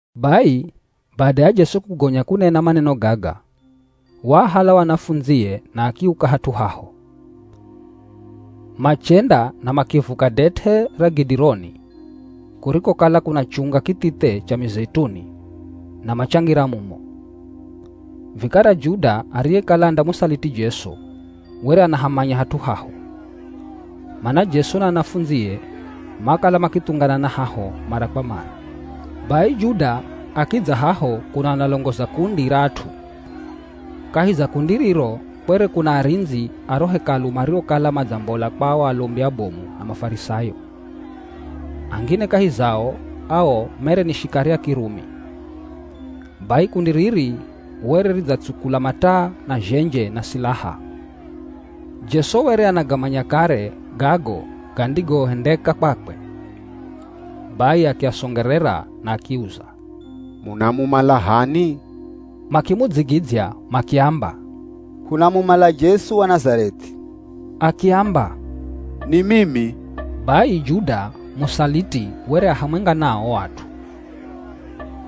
Bai bada ya Jesu kugonya kunena maneno gaga, waahala o anafundzie na akiuka hat'u haho. Machenda na makivuka det'e ra Kidironi kurikokala kuna chunga kithithe cha mizeituni na machangira mumo. Vikara Juda ariyekala andamusaliti Jesu, were anahamanya hat'u haho, mana Jesu na anafundzie makala makithunganana haho mara kwa mara. Bai Juda akidza haho kuno analongoza kundi ra at'u. Kahi za kundi riro kwere kuna arindzi a ro Hekalu mariokala madzambola kwa o alombi abomu na Mafarisayo. Angine kahi zao ao mere ni shikari a Kirumi. Bai kundi riri were ridzatsukula mataa na zhenje na silaha. Jesu were anagamanya kare gago gandigohendeka kwakwe. Bai akiasongerera na akiuza, “Munamumala h'ani?” Makimudzigidzya makiamba, “Hunamumala Jesu wa Nazareth'i.” Akiamba, “Ni mimi!” Bai Juda, musaliti were a hamwenga nao o at'u.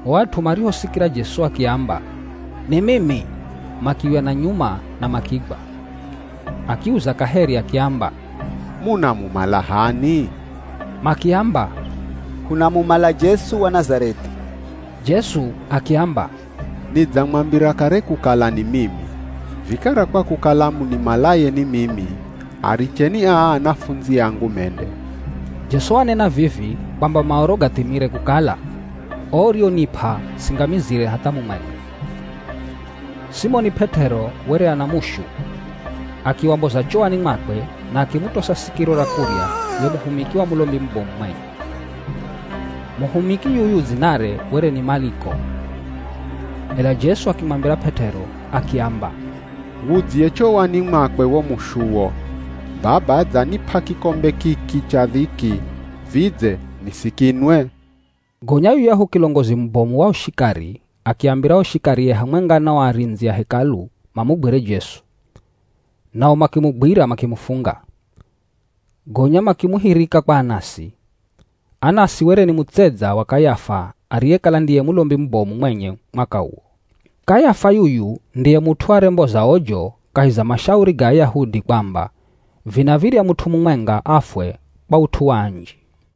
O at'u marihosikira Jesu akiamba, “Ni mimi,” makiuya na nyuma na makigwa. Akiuza kaheri akiamba, “Munamumala h'ani?” Makiamba, “Hunamumala Jesu wa Nazareth'i.” Jesu akiamba, “Nidzamwambira kare kukala ni mimi. Vikara kwa kukala munimalaye ni mimi, aricheni aa anafundzi angu mende.” Jesu wanena vivi kwamba Maoro gathimire kukala, “O urionip'a singamizire hatha mumwenga.” Simoni P'et'ero were ana mushu. Akiwamboza chowani mwakwe na akimutosa sikiro ra kurya ye muhumiki wa Mulombi mubomu mwenye. Muhumiki yuyu dzinare were ni Maliko. Ela Jesu akimwambira P'et'ero, akiamba, “Wudzye chowani mwakwe wo mushuwo. Baba adzanip'a kikombe kiki cha dhiki, vidze nisikinwe?” Gonya yuyahu kilongozi mubomu wa o shikari akiambira o shikarie hamwenga na o arindzi a Hekalu mamugwire Jesu. Nao makimugwira makimufunga. Gonya makimuhirika kwa Anasi. Anasi were ni mutsedza wa Kayafa ariyekala ndiye Mulombi mubomu mwenye mwaka uwo. Kayafa yuyu ndiye mut'u aremboza ojo kahi za mashauri ga Ayahudi kwamba vinav̱irya mut'u mumwenga afwe kwa ut'u wa anji.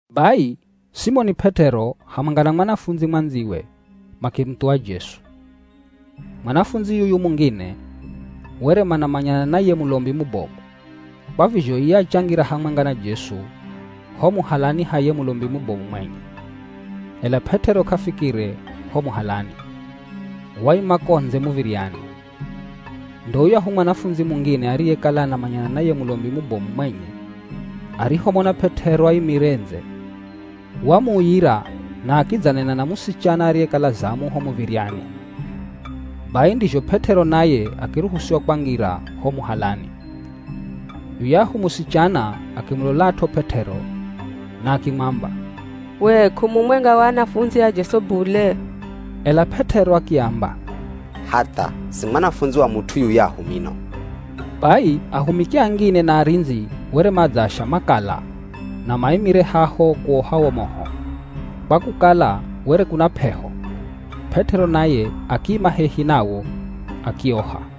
Bai Simoni P'et'ero hamwenga na mwanafundzi mwandziwe makimuthuwa Jesu. Mwanafundzi yuyu mungine were manamanyana na ye Mulombi mubomu, kwa vizho iye achangira hamwenga na Jesu ho muhalani ha ye Mulombi mubomu mwenye. Ela P'et'ero k'afikire ho muhalani, waima ko ndze muv̱iryani. Ndo yuyahu mwanafundzi mungine ariyekala anamanyana na ye Mulombi mubomu mwenye arihomona P'et'ero aimire ndze, wamuuyira na akidzanena na musichana ariyekala zamu ho muv̱iryani. Bai ndizho P'et'ero naye akiruhusiwa kwangira ho muhalani. Yuyahu musichana akimulolat'o P'et'ero na akimwamba, “We k'umumwenga wa anafundzi a Jesu bule?” Ela P'et'ero akiamba, “Hatha si mwanafundzi wa mut'u yuyahu mino.” Bai ahumiki angine na arindzi were madzaasha makala na maimire haho kuoha wo moho, kwa kukala were kuna p'eho. P'et'ero naye akiima hehi nawo akioha.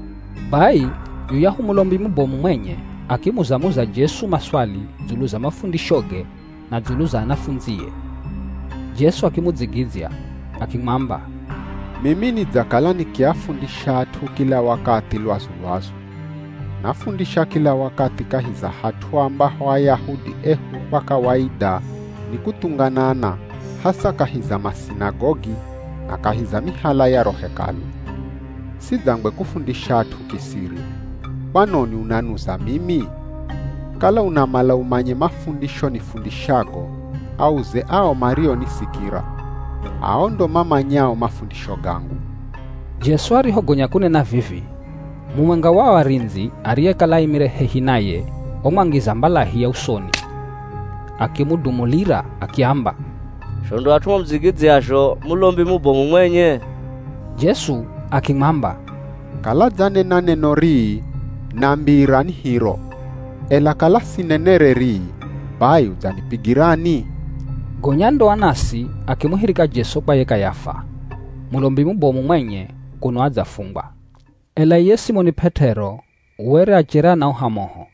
Bai yuyahu Mulombi mubomu mwenye akimuza-muza Jesu maswali dzulu za mafundishoge na dzulu za anafundzie. Jesu akimudzigidzya akimwamba, “Mimi nidzakala nikiafundisha at'u kila wakathi lwazu-lwazu. Nafundisha kila wakathi kahi za hat'u ambaho Ayahudi ehu kwa kawaida ni kuthunganana hasa kahi za masinagogi na kahi za mihala ya ro Hekalu. Sidzangwe kufundisha at'u kisiri. Kwanoni unanuza mimi? Kala unamala umanye mafundisho nifundishago, auze ao marionisikira. Ao ndo mamanyao mafundisho gangu.” Jesu arihogonya kunena vivi, mumwenga wa o arindzi ariyekala aimire hehi naye wamwangiza mbalahi ya usoni, akimudumulira akiamba, “Zho ndo at'u mamudzigidzyazho Mulombi mubomu mwenye?” Jesu akimwamba, “Kala dzanena neno rii, nambira, ni hiro. Ela kala sinenere rii, bai udzanipigirani?” Gonya ndo Anasi akimuhirika Jesu kwa ye Kayafa, Mulombi mubomu mwenye kuno adzafungwa. Ela iye Simoni P'et'ero were achere anaoha moho.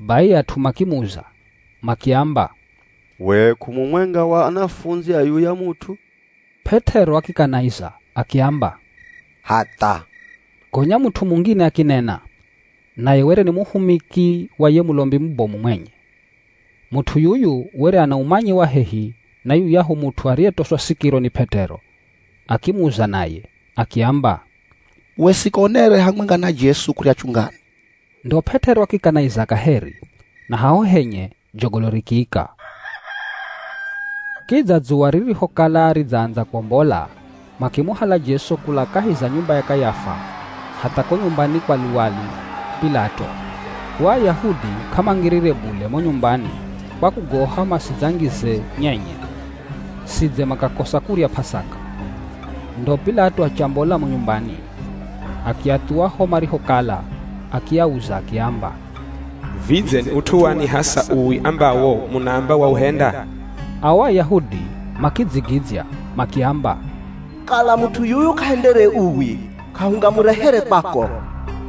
Bai at'u makimuza makiamba, “We k'umumwenga wa anafundzi a yuya mut'u?” P'et'ero akikanaiza akiamba, “Hatha!” Gonya mut'u mungine akinena. Naye were ni muhumiki wa ye Mulombi mubomu mwenye. Mut'u yuyu were ana umanyi wa hehi na yuyahu mut'u ariyetoswa sikiro ni P'et'ero. Akimuza naye, akiamba, “We sikonere hamwenga na Jesu kurya chungani?” Ndo P'et'ero akikanaiza kaheri na haho henye jogolo rikiika. Kidza dzuwa ririhokala ridzaandza kwombola makimuhala Jesu kula kahi za nyumba ya Kayafa hatha ko nyumbani kwa luwali P'ilato. O Ayahudi k'amangirire bule mo nyumbani kwa kugoha masidzangize nyenye, sidze makakosa kurya P'asaka. Ndo P'ilato achambola mo nyumbani akiathuwa ho marihokala akiauza akiamba, “Vidze ni ut'u wani hasa uwi ambawo munaamba wauhenda?” Ao Ayahudi makidzigidzya makiamba, “Kala mut'u yuyu k'ahendere uwi k'ahungamurehere kwako!”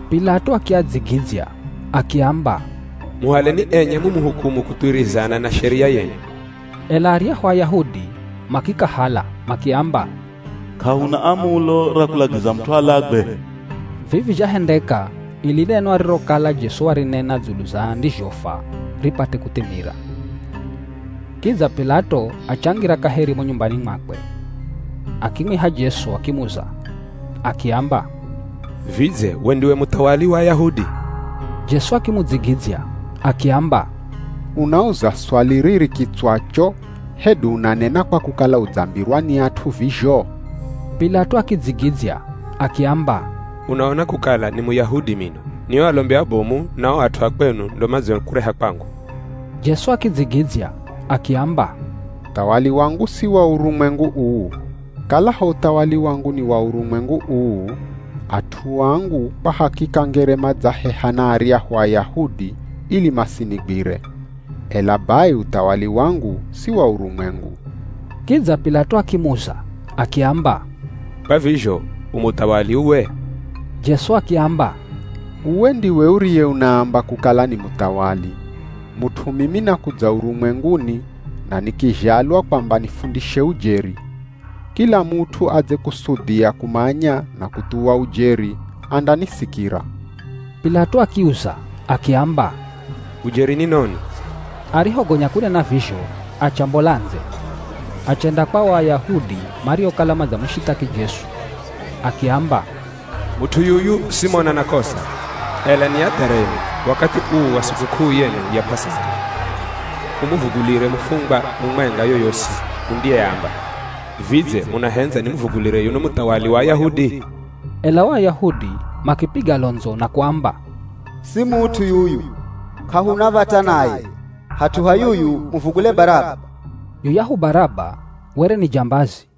P'ilato akiadzigidzya akiamba, “Muhaleni enye mumuhukumu kuthuwirizana na sheria yenu.” Ela aryahu Ayahudi makikahala makiamba, “K'ahuna amulo ra kulagiza mut'u alagwe.” Vivi zhahendeka ili neno arirokala Jesu warinena dzulu za andizhofwa ripate kuthimira. Kidza P'ilato achangira kaheri mo nyumbani mwakwe. Akimwiha Jesu akimuza akiamba, “Vidze we ndiwe muthawali wa Ayahudi?” Jesu akimudzigidzya akiamba, “Unauza swali riri kitswacho hedu unanena kwa kukala udzambirwa ni at'u vizho?” P'ilato akidzigidzya akiamba, “Unaona kukala ni Muyahudi mino? Ni o alombi abomu, na o at'u akwenu ndo madziokureha kwangu.” Jesu akidzigidzya akiamba, “Uthawali wangu si wa urumwengu uu. Kalaho uthawali wangu ni wa urumwengu uu, at'u angu, kwa hakika ngere madzaheha na aryahu Ayahudi ili masinigwire. Ela bai uthawali wangu si wa urumwengu.” Kidza P'ilato akimuza akiamba, “Kwa vizho u muthawali uwe?” Jesu akiamba, “Uwe ndiwe uriye unaamba kukala ni muthawali. Mut'u mimi nakudza urumwenguni na nikizhalwa kwamba nifundishe ujeri. Kila mut'u adzekusudhia kumanya na kuthuwa ujeri, andanisikira.” P'ilato akiuza akiamba, “Ujeri ni noni?” Arihogonya kunena vizho, achambola ndze, achenda kwa o Ayahudi mariokala madzamushithaki Jesu akiamba, “Mut'u yuyu simona na kosa! Ela ni adha renu wakathi uu wa sikuk'uu yenu ya P'asaka humuvugulire mufungwa mumwenga yoyosi mundiyeamba. Vidze munahendza nimuvulire yuno muthawali wa Ayahudi?” Ela o Ayahudi makipiga londzo na kuamba, “Si mut'u yuyu, k'ahuna v̱ata naye, hat'u ha yuyu muvugule Baraba!” Yuyahu Baraba were ni jambazi.